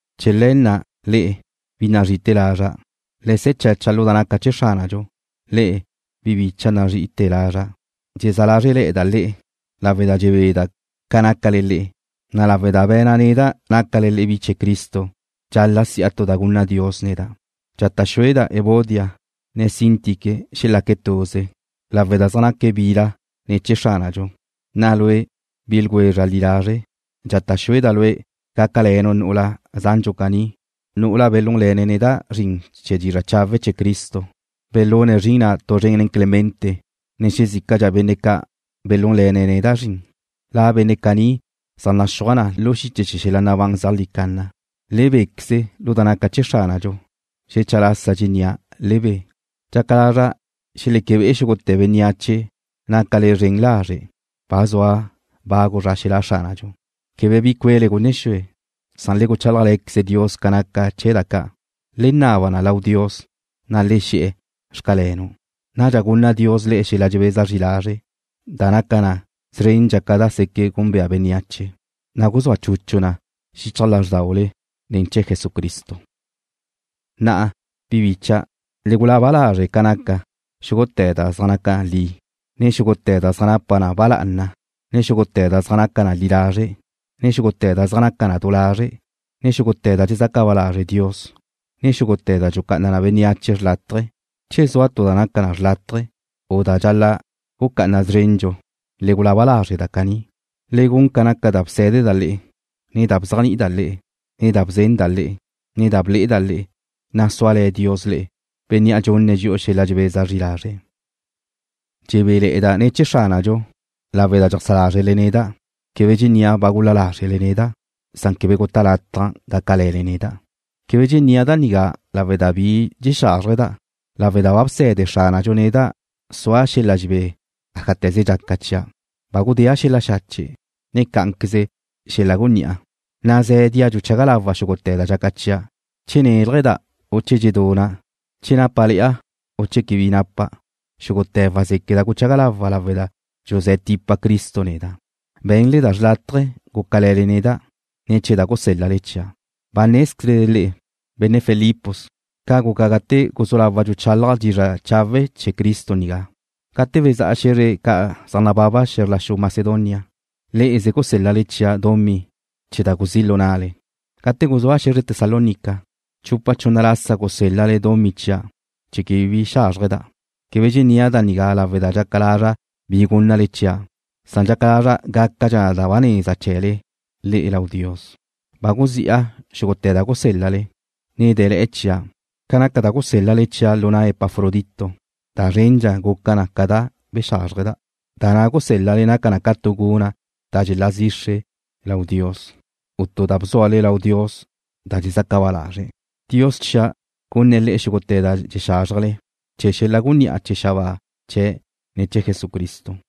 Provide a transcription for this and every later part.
Chee̱ le̱ na' le'e, bi nazri'ite̱ lazra', le se̱ chacha lu da naca chee̱ Xránadxu. Le'e, bi bícha'dau' nazrí'ite lazra', dxezá lázrele̱'a le'eda' le'e, lawe' da dxebeda' ca nácale le'e, na' lawe' da be̱na' neda' nácale bi chee̱ Cristo dxal-la' si'a tu da gunna Dios neda'. Dxata' xueda' Evodia, ne Síntique xelaque̱' tuze, lawe' da zaj naque̱' bila ne̱ chee̱ Xránadxu. Na'a lue', bi ljwezra' li lazre', dxata' xueda' lue' gácale̱nu' nu'ula zandxu caní, nu'ula belúnle̱ne̱' neda' zrin chee̱ dizra' chawe' chee̱ Cristo. Belune̱' zrin na' tu zren nen Clemente, ne xezícadxa benne' ca' belúnle̱ne̱' neda' zrin. La benne' caní zaj naxúaj na lu xiche chee̱ xel-la nabán zeajlí canna. Le béqueze lu da naca chee̱ Xránadxu. Xecha lasa dxennía': Le be. Dxaca lazra' xeleque be'e xúgute̱ bénneache nácale zren lazre'. Ba zua bagu zra xelá' Xránadxu. Quebe bi cuele gunne xue, san le guchálajle̱queze Dios ca naca chee̱ da ca'. Le naba na lau Dios, na' le xe̱'e̱: Xcalenu'. Nadxa gunna Dios le'e xel-la dxebeza zri lazre', da naca na szrendxa ca da seque' gúnbea bénneache, na' guzúa chuchu na xichaj lázrdaule ne̱ chee̱ Jesucristo. Na'a, bi bicha', le gulaba lazre' ca naca xúgute̱ da zaj naca li, ne xúgute̱ da zaj napa na ba lá'ana, ne xúgute̱ da zaj naca na li lazre', ne xúgute̱ da zaj naca na du lazre', ne xúgute̱ da dxezaca ba lazre' Dios, ne xúgute̱ da dxulucá'ana na bénneache xrlátaje. Che zua tu da naca xrlátaje, u da dxal-la' gucá'ana szrendxu, le gulaba lazre' da caní. Le gun ca naca da bsé̱deda' le'e, ne da bzéajni'ida' le'e, ne da bzenda' le'e, ne da ble'eda' le'e, na' súale̱ Dios le'e, Bénnea' dxunne̱' dxi'u xel-la dxebeza zri lazre'. Dxebéle̱'e̱da' ne̱ chee̱ Xránadxu, lawe' da dxajsá lázrele neda'. Quebe dxennía' ba gul-la lázrele neda', san quebe guta' lataj gácale̱le neda'. Quebe dxennía' da nigá lawe' da bi dxexázrjeda', lawe' da ba bse̱de Xránadxu neda' sua' xel-la dxebé ájate̱ze dxaca chia'. Ba gudéa' xel-la xache', ne cá'anqueze xel-la gunní'a. Nazé̱dia' dxuchaga lawa' xúgute̱ da dxaca chia', che néljada', u che dxeduna', che nápale̱'a, u che quebe bi napa'. Xúgute̱ wazéqueda' guchaga lawa' lawe' da dxuzé̱ tipa Cristo neda'. Be̱nle da xrlátaje, gúcale̱le neda' ne̱ chee̱ da gusél-lale chia'. Ba nézquezle le'e, benne' Filipos, ca guca gate guzú lawa' dxuchálaja' dizra' chawe' chee̱ Cristo nigá. Gate bezá'a xe̱zre ca' zaj nababa xe̱zr la xu Macedonia, le'eze gusél-lale chia' dumí chee̱ da guzí' lu na'le. Gate guzúa' xe̱zre Tesalónica, chupa chunna lasa gusél-lale dumí chia' chee̱ quebe bi xázrjeda'. Quebe dxennía' da nigá lawe' da dxaca lazra' bi gúnnale chia', san dxaca lazra' gácadxa da ba neza chee̱le le'e lau Dios. Ba guzi'a xúgute̱ da gusél-lale, na' de̱le̱'e̱ chia'. Ca naca da gusélal-le chia' lu na' Epafrodito, da zrendxa guca na ca da bexázrjeda'. Da na' gusél-lale naca na ca tu guna' da dxelá zixre na lau Dios, u tu da bzúale lau Dios da dxezaca ba lazre̱'. Dios chia' gunne̱' le'e xúgute̱ da dxexázrjele, chee̱ xel-la gunní'a chee̱ xabáa chee̱' ne̱ chee̱ Jesucristo.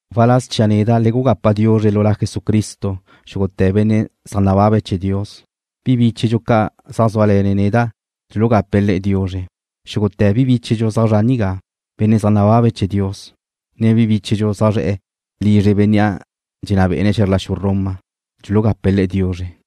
Waláz chia' neda' le gugapa diuzre lu La Jesucristo xúgute̱ benne' zaj nababe̱' chee̱ Dios. Bi bíchedxu ca' zaj zúale̱ neda' dxulugape̱' le'e diuzre. Xúgute̱ bi bíchedxu zaj zre'e nigá, benne' zaj nababe̱' chee̱ Dios, ne bi bíchedxu zaj zre̱'e̱ lizre bénnea' dxenná bé'ene̱' xe̱zr la xu Roma, dxulugape̱' le'e diuzre.